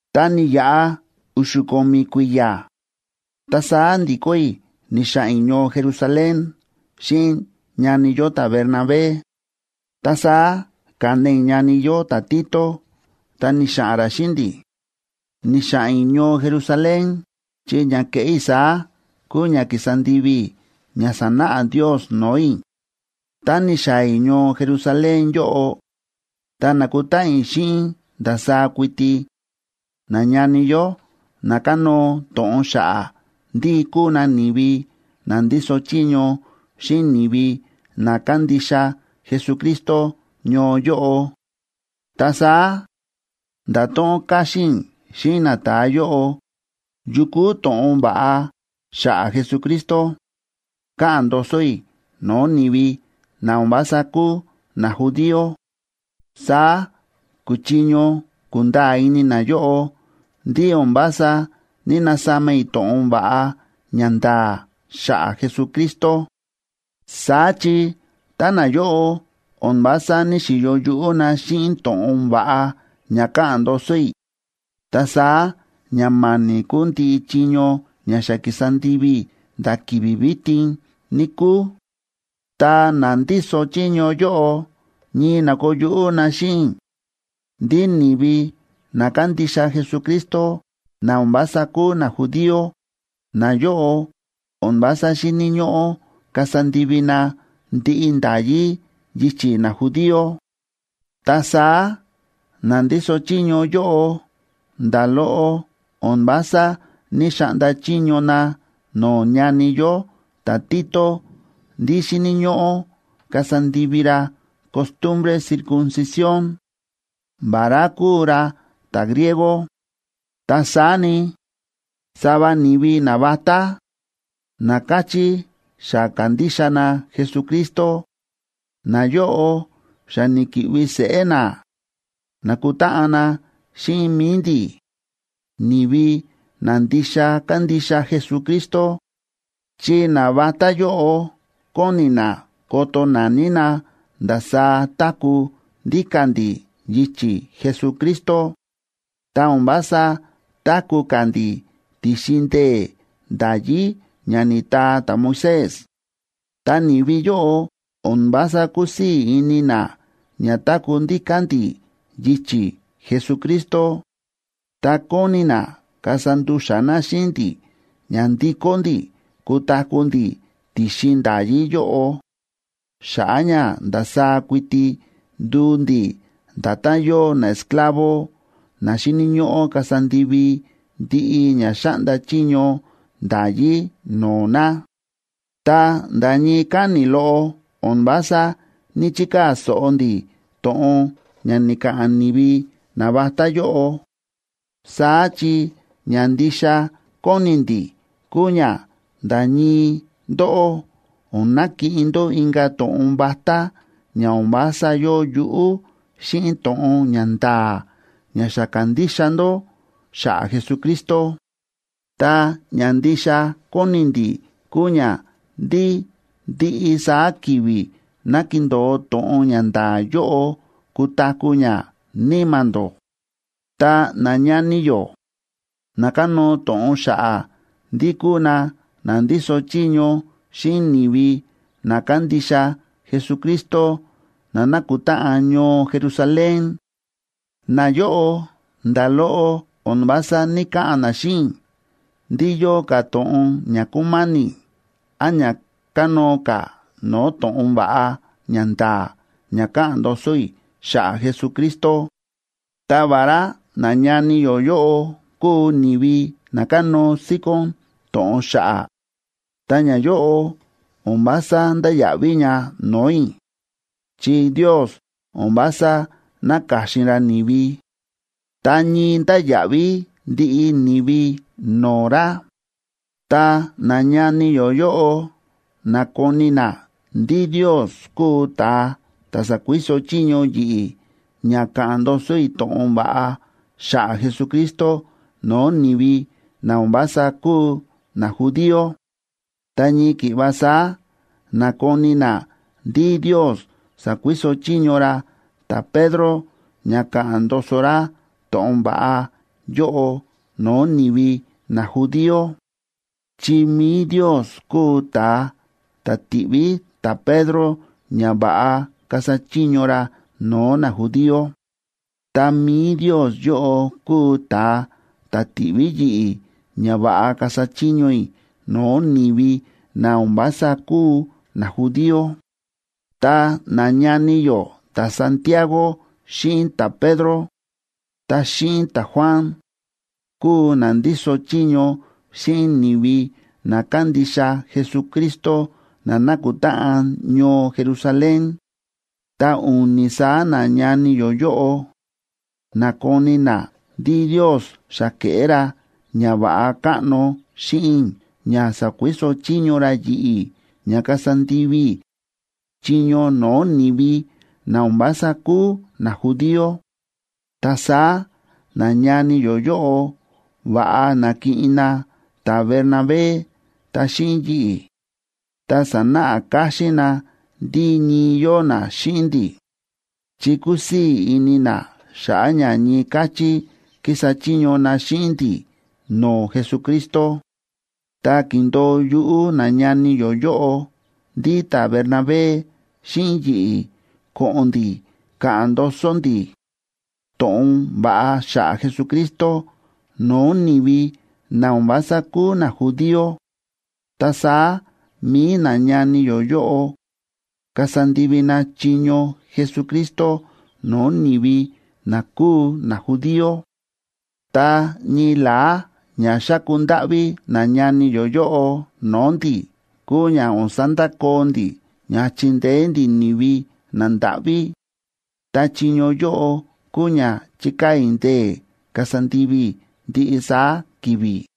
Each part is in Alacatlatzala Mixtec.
Ta ni̱yaꞌa u̱xu̱ ko̱mi̱ kui̱ya̱, ta saá ndi̱kó i̱ ni̱xa̱ꞌa̱n i̱ ñoo Jerusalén xíꞌin ñani yó ta̱Bernabé, ta saá ka̱na i̱ ñani yó ta̱Tito ta ni̱xa̱ꞌa̱n ra xíꞌin ndi̱. Ni̱xa̱ꞌa̱n i̱ ñoo Jerusalén, chi ña ke̱ꞌé i̱ saá kúu ña ki̱sa ndivi i̱ ña sa̱náꞌa Ndios no̱o̱ i̱. Tá ni̱xaa̱ i̱ ñoo Jerusalén yóꞌo ta na̱kutáꞌan i̱ xíꞌin ndasaá kuiti nañani yó na kánóo to̱ꞌon xa̱ꞌa̱ ndí kúu na ni̱vi na ndíso chiño xíꞌin ni̱vi na kándixa Jesucristo ñoo yóꞌo. Ta saá nda̱to̱ꞌon káxín i̱ xíꞌin nata̱a yóꞌo yu kúu to̱ꞌon va̱ꞌa xa̱ꞌa̱ Jesucristo káꞌa̱n ndoso i̱ no̱o̱ ni̱vi na o̱n vása kúu najudío. Saá kuchiño kunda̱a̱ ini nayóꞌo ndí o̱n vása ní‑nasama i̱ to̱ꞌon va̱ꞌa ña nda̱a̱ xa̱ꞌa̱ Jesucristo. Saá chi tá nayóꞌo o̱n vása ní‑xiyo yuꞌú na xíꞌin to̱ꞌon va̱ꞌa ña káꞌa̱n ndoso i̱, ta saá ña ma̱ni̱ kuu ndiꞌi chiño ña xa kísa ndivi i̱ nda̱ ki̱vi̱ vitin, níkúu. Ta na ndíso chiño yóꞌo ñii na̱koo yuꞌú na xíꞌin i̱ ndí ni̱vi na kándixa Jesucristo, na o̱n vása kúu najudío, nayóꞌo o̱n vása xíni̱ ñóꞌó kasa ndivi na ndiꞌi nda̱yí yichi̱ najudío. Ta saá na ndíso chiño yóꞌo nda̱ loꞌo o̱n vása ní‑xaꞌnda chiño na no̱o̱ ñani yó ta̱Tito ndí xíni̱ ñóꞌó kasa ndivi ra costumbre circuncisión,a vará kúu ra ta̱griego. Ta saá ni, sava ni̱vi navatá, na káchí xa ka̱ndixa na Jesucristo, nayóꞌo xa ni̱ki̱ꞌvi seꞌé na na̱kutáꞌan na xíꞌin mi̱i ndi̱, ni̱vi na ndixa kándixa Jesucristo, chi navatá yóꞌo kóni na koto naní na ndasaá táku̱ ndíka̱ ndi̱ yichi̱ Jesucristo, ta o̱n vása táku̱ ka̱ ndi̱ ti̱xin ndee̱ nda̱yí ña ni̱taa ta̱Moisés. Ta ni̱vi yóꞌo o̱n vása kúsii̱ ini na ña táku̱ ndíka̱ ndi̱ yichi̱ Jesucristo, ta kóni na kasa ndu̱xa̱ na xíꞌin ndi̱ ña ndikó ndi̱ kutaku̱ ndi̱ ti̱xin nda̱yí yóꞌo, xa̱ꞌa̱ ña ndasaá kuiti nduu ndi̱ nda̱tán yóo naesclavo na xíni̱ ñóꞌó kasa ndivi ndiꞌi ña xáꞌnda chiño nda̱yí no̱o̱ na. Ta nda̱ ñii káni̱ loꞌo o̱n vása ní‑chikaa̱ so̱ꞌo ndi̱ to̱ꞌon ña ni̱ka̱ꞌa̱n ni̱vi navatá yóꞌo. Saá chi ña ndixa kóni ndi̱ kúu ña nda̱ ñii ndóꞌó o̱n nakiꞌin ndó inka̱ to̱ꞌon vatá ña o̱n vása yóo yuꞌú xíꞌin to̱ꞌon ña nda̱a̱ ña xa ka̱ndixa ndó xa̱ꞌa̱ Jesucristo. Ta ña ndixa kóni ndi̱ kúu ña ndí ndiꞌi saá ki̱vi̱ ná kindo̱o to̱ꞌon ña nda̱a̱ yóꞌo kutaku̱ ña níma̱ ndó. Ta nañani yó na kánóo to̱ꞌon xa̱ꞌa̱ ndí kúu na na ndíso chiño xíꞌin ni̱vi na kándixa Jesucristo na nákutáꞌan ñoo Jerusalén, nayóꞌo nda̱ loꞌo o̱n vása ní‑kaꞌa̱n na xíꞌin i̱ ndí yóo ka̱ to̱ꞌon ña kúma̱ni̱ án ña kánóo ka̱ no̱o̱ to̱ꞌon va̱ꞌa ña nda̱a̱ ña káꞌa̱n ndoso i̱ xa̱ꞌa̱ Jesucristo. Ta vará nañani yó yóꞌo kúu ni̱vi na kánóo síkón to̱ꞌon xa̱ꞌa̱, ta ñayóꞌo o̱n vása ndáya̱ꞌví ña no̱o̱ i̱, chi Ndios o̱n vása náka̱xin ra ni̱vi, ta ñii ndáya̱ꞌví ndiꞌi ni̱vi no̱o̱ ra. Ta nañani yó yóꞌo na̱koni na ndí Ndios kúu ta̱a ta̱ sa̱kuiso chiño yi̱ꞌi̱ ña ka̱ꞌa̱n ndoso i̱ to̱ꞌon va̱ꞌa xa̱ꞌa̱ Jesucristo no̱o̱ ni̱vi na o̱n vása kúu najudío, ta ñii ki̱ꞌva saá na̱koni na ndí Ndios sa̱kuiso chiño ra ta̱Pedro ña ka̱ꞌa̱n ndoso ra to̱ꞌon va̱ꞌa yóꞌo no̱o̱ ni̱vi najudío. Chi mi̱i Ndios kúu ta̱a ta̱ ti̱ꞌví ta̱Pedro ña va̱ꞌa kasa chiño ra no̱o̱ najudío. Ta mi̱i Ndios yóꞌo kúu ta̱a ta̱ ti̱ꞌví yi̱ꞌi̱ ña va̱ꞌa kasa chiño i̱ no̱o̱ ni̱vi na o̱n vása kúu najudío. Ta nañani yó ta̱Santiago xíꞌin ta̱Pedro ta xíꞌin ta̱Juan, kúu na ndíso chiño xíꞌin ni̱vi na kándixa Jesucristo na nákutáꞌan ñoo Jerusalén. Ta u̱ni̱ saá nañani yó yóꞌo na̱koni na ndí Ndios xa ke̱ꞌé ra ñava̱ꞌa káꞌno xíꞌin i̱ ña sa̱kuiso chiño ra yi̱ꞌi̱ ña kasa ndivi i̱ chiño no̱o̱ ni̱vi na o̱n vása kúu najudío. Ta saá nañani yó yóꞌo va̱ꞌa na̱kiꞌin na ta̱Bernabé ta xíꞌin yi̱ꞌi̱, ta sa̱náꞌa káxín na ndí ñii yóo na xíꞌin ndi̱, chi kúsii̱ ini na xa̱ꞌa̱ ña ñii káchí kísa chiño na xíꞌin ndi̱ no̱o̱ Jesucristo. Ta ki̱ndo̱o yuꞌú nañani yó yóꞌo ndí ta̱Bernabé xíꞌin yi̱ꞌi̱ ko̱ꞌo̱n ndi̱ ka̱ꞌa̱n ndoso ndi̱ to̱ꞌon va̱ꞌa xa̱ꞌa̱ Jesucristo no̱o̱ ni̱vi na o̱n vása kúu najudío, ta saá mi̱i nañani yó yóꞌo kasa ndivi na chiño Jesucristo no̱o̱ ni̱vi na kúu najudío. Ta ñii la̱á ña xáku ndáꞌví nañani yó yóꞌo no̱o̱ ndi̱ kúu ña o̱n sandakoo ndi̱ ña chindeé ndi̱ ni̱vi nandáꞌví. Ta chiño yóꞌo kúu ña chíkaa̱ i̱ ndee̱ kasa ndivi i̱ ndiꞌi saá ki̱vi̱.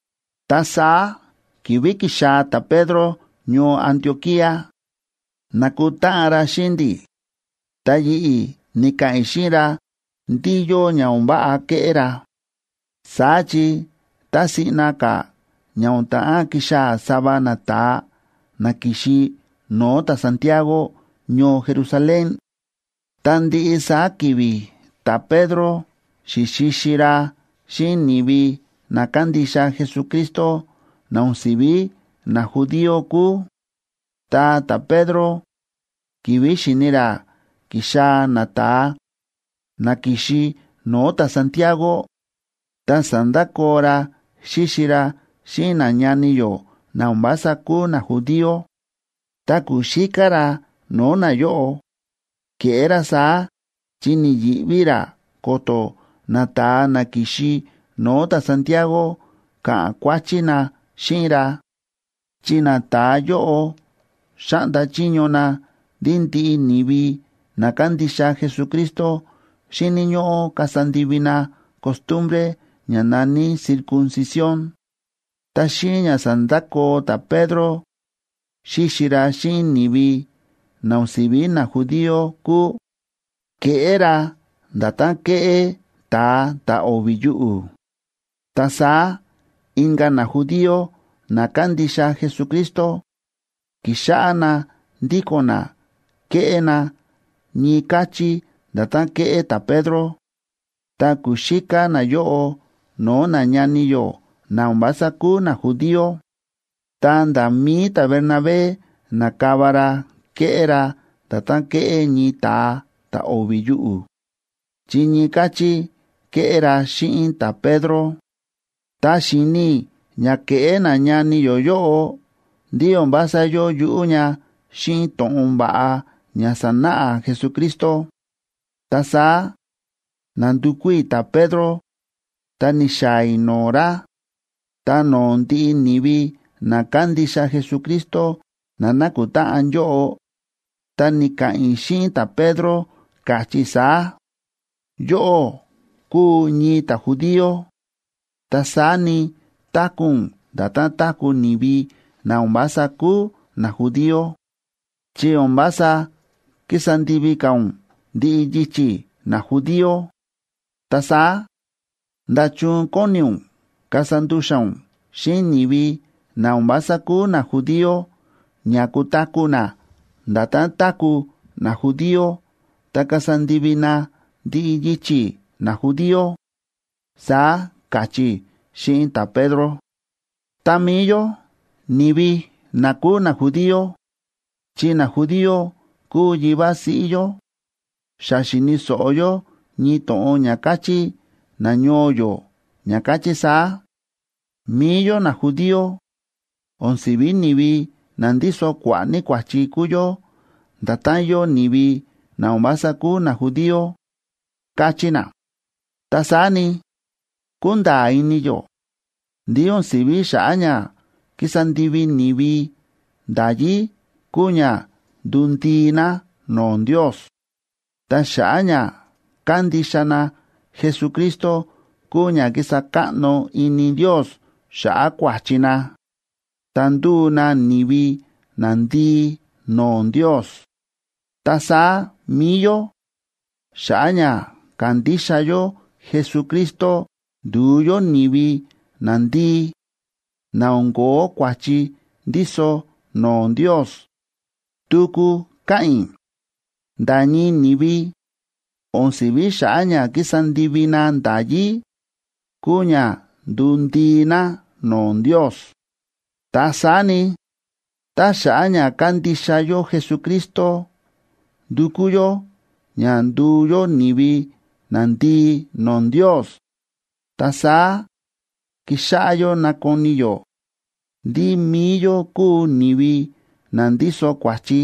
Ta saá ki̱vi̱ ki̱xaa̱ ta̱Pedro ñoo Antioquía, na̱kutáꞌan ra xíꞌin ndi̱, ta yi̱ꞌi̱ ni̱ka̱ꞌa̱n i̱ xíꞌin ra ndí yóo ña o̱n váꞌa kéꞌé ra. Saá chi tá siꞌna ka̱ ña o̱n ta̱ꞌán kixaa̱ sava nata̱a na ki̱xi no̱o̱ ta̱Santiago ñoo Jerusalén, ta ndiꞌi saá ki̱vi̱ ta̱Pedro xi̱xixi ra xíꞌin ni̱vi na kándixa Jesucristo na o̱n si̱ví najudío kúu. Ta ta̱Pedro, ki̱vi̱ xi̱ni ra ki̱xaa̱ nata̱a na ki̱xi no̱o̱ ta̱Santiago, ta sa̱ndakoo ra xíxi ra xíꞌin nañani yó na o̱n vása kúu najudío, ta ku̱xíká ra no̱o̱ nayóꞌo. Ke̱ꞌé ra saá chi ni̱yi̱ꞌví ra ko̱to̱ nata̱a na ki̱xi no̱o̱ ta̱Santiago ka̱ꞌa̱n kuáchí na xíꞌin ra, chi nata̱a yóꞌo xáꞌnda chiño na ndí ndiꞌi ni̱vi na kándixa Jesucristo xíni̱ ñóꞌó kasa ndivi na costumbre ña na̱ní circuncisión. Ta xíꞌin ña sa̱ndakoo ta̱Pedro xíxi ra xíꞌin ni̱vi na o̱n si̱vi najudío kúu, ke̱ꞌé ra nda̱tán kéꞌé ta̱a ta̱ o̱vi̱ yuꞌu̱. Ta saá inka̱ najudío na kándixa Jesucristo ki̱xáꞌá na ndíko̱n na kéꞌé na ñii káchí nda̱tán kéꞌé ta̱Pedro, ta ku̱xíká nayóꞌo no̱o̱ nañani yó na o̱n vása kúu najudío. Ta nda̱ mi̱i ta̱Bernabé na̱kava ra ke̱ꞌé ra nda̱tán kéꞌé ñii ta̱a ta̱ o̱vi̱ yuꞌu̱, chi ñii káchí ke̱ꞌé ra xíꞌin ta̱Pedro. Tá xi̱ni i̱ ña kéꞌé nañani yó yóꞌo ndí o̱n vása yóo yuꞌú ña xíꞌin to̱ꞌon va̱ꞌa ña sa̱náꞌa Jesucristo, ta saá na̱ndukú i̱ ta̱Pedro, ta ni̱xaa̱ i̱ no̱o̱ ra, ta no̱o̱ ndiꞌi ni̱vi na kándixa Jesucristo na na̱kutáꞌan yóꞌo, ta ni̱ka̱ꞌa̱n i̱ xíꞌin ta̱Pedro, káchí i̱ saá: “Yóꞌó kúu ñii ta̱judío, ta saá ni, táku̱ ún nda̱tán táku̱ ni̱vi na o̱n vása kúu najudío, chi o̱n vása kísa ndivi ka̱ ún ndiꞌi yichi̱ najudío. Ta saá, ¿nda̱chun kóni ún kasa ndu̱xa̱ ún xíꞌin ni̱vi na o̱n vása kúu najudío ña kutaku̱ na nda̱tán táku̱ najudío ta kasa ndivi na ndiꞌi yichi̱ najudío?”, saá káchí i̱ xíꞌin ta̱Pedro. Ta mi̱i yó ni̱vi na kúu najudío, chi najudío kúu yivá siꞌí yó, xa xi̱ni̱ so̱ꞌo yó ñii to̱ꞌon ña káchí nañoo yó ña káchí saá: “Mi̱i yó najudío o̱n si̱vi ni̱vi na ndíso kua̱ꞌa̱ ní kua̱chi kúu yó nda̱tán yóo ni̱vi na o̱n vása kúu najudío”, káchí na. Ta saá ni, kúnda̱a̱ ini yó ndí o̱n si̱ví xa̱ꞌa̱ ña kísa ndivi ni̱vi nda̱yí kúu ña nduu ndii na no̱o̱ Ndios, ta xa̱ꞌa̱ ña kándixa na Jesucristo kúu ña kísa káꞌno ini Ndios xa̱ꞌa̱ kua̱chi na, ta ndúu na ni̱vi nandii no̱o̱ Ndios. Ta saá mi̱i yó xa̱ꞌa̱ ña ka̱ndixa yó Jesucristo, ndu̱u yó ni̱vi nandii, na o̱n ko̱ó kua̱chi ndíso no̱o̱ Ndios. Tuku káꞌa̱n i̱: Nda̱ ñii ni̱vi o̱n si̱ví xa̱ꞌa̱ ña kísa ndivi na nda̱yí kúu ña nduu ndii na no̱o̱ Ndios. Ta saá ni, tá xa̱ꞌa̱ ña kándixa yó Jesucristo ndúkú yó ña nduu yó ni̱vi nandii no̱o̱ Ndios, ta saá kíxáꞌá yó nákoni yó ndí mi̱i yó kúu ni̱vi na ndíso kua̱chi,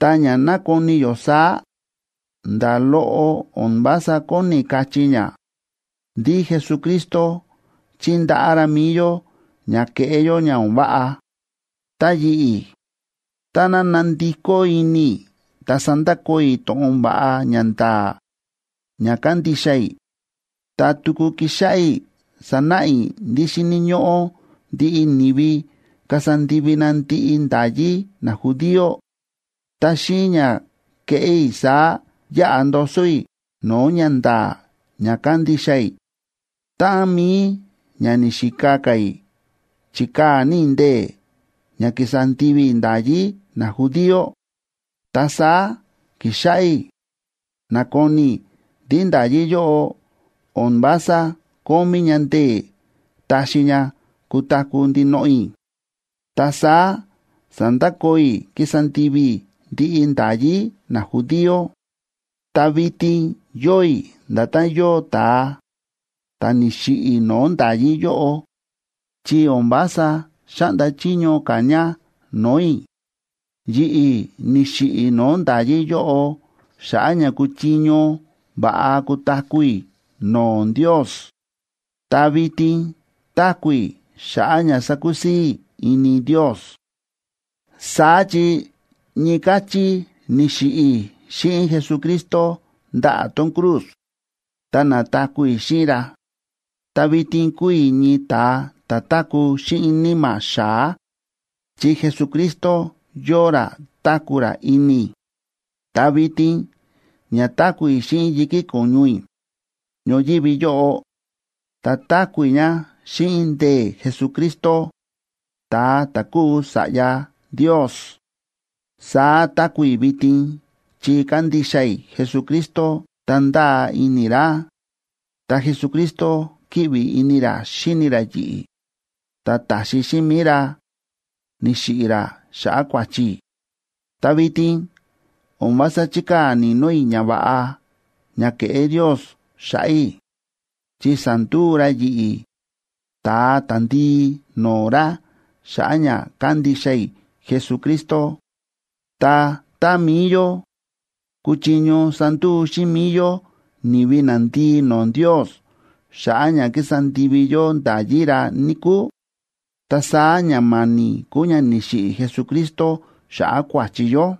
ta ña nákoni yó saá, nda̱ loꞌo o̱n vása kóni kachí ña ndí Jesucristo chi̱ndaꞌá ra mi̱i yó ña keꞌé yó ña o̱n váꞌa. Ta yi̱ꞌi̱, táná nandikó ini i̱ ta sandakoo i̱ to̱ꞌon va̱ꞌa ña nda̱a̱ ña kándixa i̱, ta tuku kixáꞌá i̱ sanáꞌa i̱ ndí xíni̱ ñóꞌó ndiꞌi ni̱vi kasa ndivi na ndiꞌi nda̱yí najudío, ta xíꞌin ña keꞌé i̱ saá yaꞌa ndoso i̱ no̱o̱ ñanda̱a̱ ña kándixa i̱. Táꞌan mi̱i ña ni̱xika ka̱ i̱ chíkaa̱ ní i̱ ndee̱ ña kísa ndivi i̱ nda̱yí najudío, ta saá ki̱xáꞌá i̱ nakoni i̱ ndí nda̱yí yóꞌo o̱n vása kómí ña ndee̱ taxi ña kutaku̱ ndinoꞌo i̱. Ta saá sa̱ndakoo i̱ kísa ndivi i̱ ndiꞌi nda̱yí najudío, ta vitin yóo i̱ nda̱tán yóo ta̱a ta̱ni̱xiꞌi̱ no̱o̱ nda̱yí yóꞌo, chi o̱n vása xáꞌnda chiño ka̱ ña no̱o̱ i̱. Yi̱ꞌi̱ ni̱xiꞌi̱ i̱ no̱o̱ nda̱yí yóꞌo xa̱ꞌa̱ ña kuchiño va̱ꞌa kutaku̱ i̱ no̱o̱ Ndios, ta vitin táku̱ i̱ xa̱ꞌa̱ ña sakusii̱ i̱ ini Ndios. Saá chi ñii káchí ni̱xiꞌi̱ i̱ xíꞌin Jesucristo ndaꞌa̱ tón cruz, ta na̱taku̱ i̱ xíꞌin ra. Ta vitin kúu i̱ ñii ta̱a ta̱ táku̱ xíꞌin níma̱ xa̱á chi Jesucristo yóo ra táku̱ ra ini i̱. Ta vitin ña táku̱ i̱ xíꞌin yi̱kí ko̱ñu i̱ ñoyívi yóꞌo, ta táku̱ i̱ ña xíꞌin ndee̱ Jesucristo, ta̱a ta̱ kúu Sa̱ꞌya Ndios. Saá táku̱ i̱ vitin chi kándixa i̱ Jesucristo ta ndáa ini i̱ ra, ta Jesucristo kíꞌvi ini ra xíni ra yi̱ꞌi̱, ta ta̱xi xíꞌin mi̱i ra ni̱xiꞌi̱ ra xa̱ꞌa̱ kua̱chi i̱. Ta vitin o̱n vása chíkaa̱ ni̱no̱ i̱ ñava̱ꞌa ña ke̱ꞌé Ndios xa̱ꞌa̱ i̱, chi sa̱nduu ra yi̱ꞌi̱ ta̱a ta̱ndii no̱o̱ ra xa̱ꞌa̱ ña kándixa i̱ Jesucristo. Ta tá mi̱i yó kuchiño sanduu xíꞌin mi̱i yó ni̱vi nandii no̱o̱ Ndios xa̱ꞌa̱ ña ki̱sa ndivi yó nda̱yí ra, níkúu, ta saá ña ma̱ni̱ kuu ña ni̱xiꞌi̱ Jesucristo xa̱ꞌa̱ kua̱chi yó.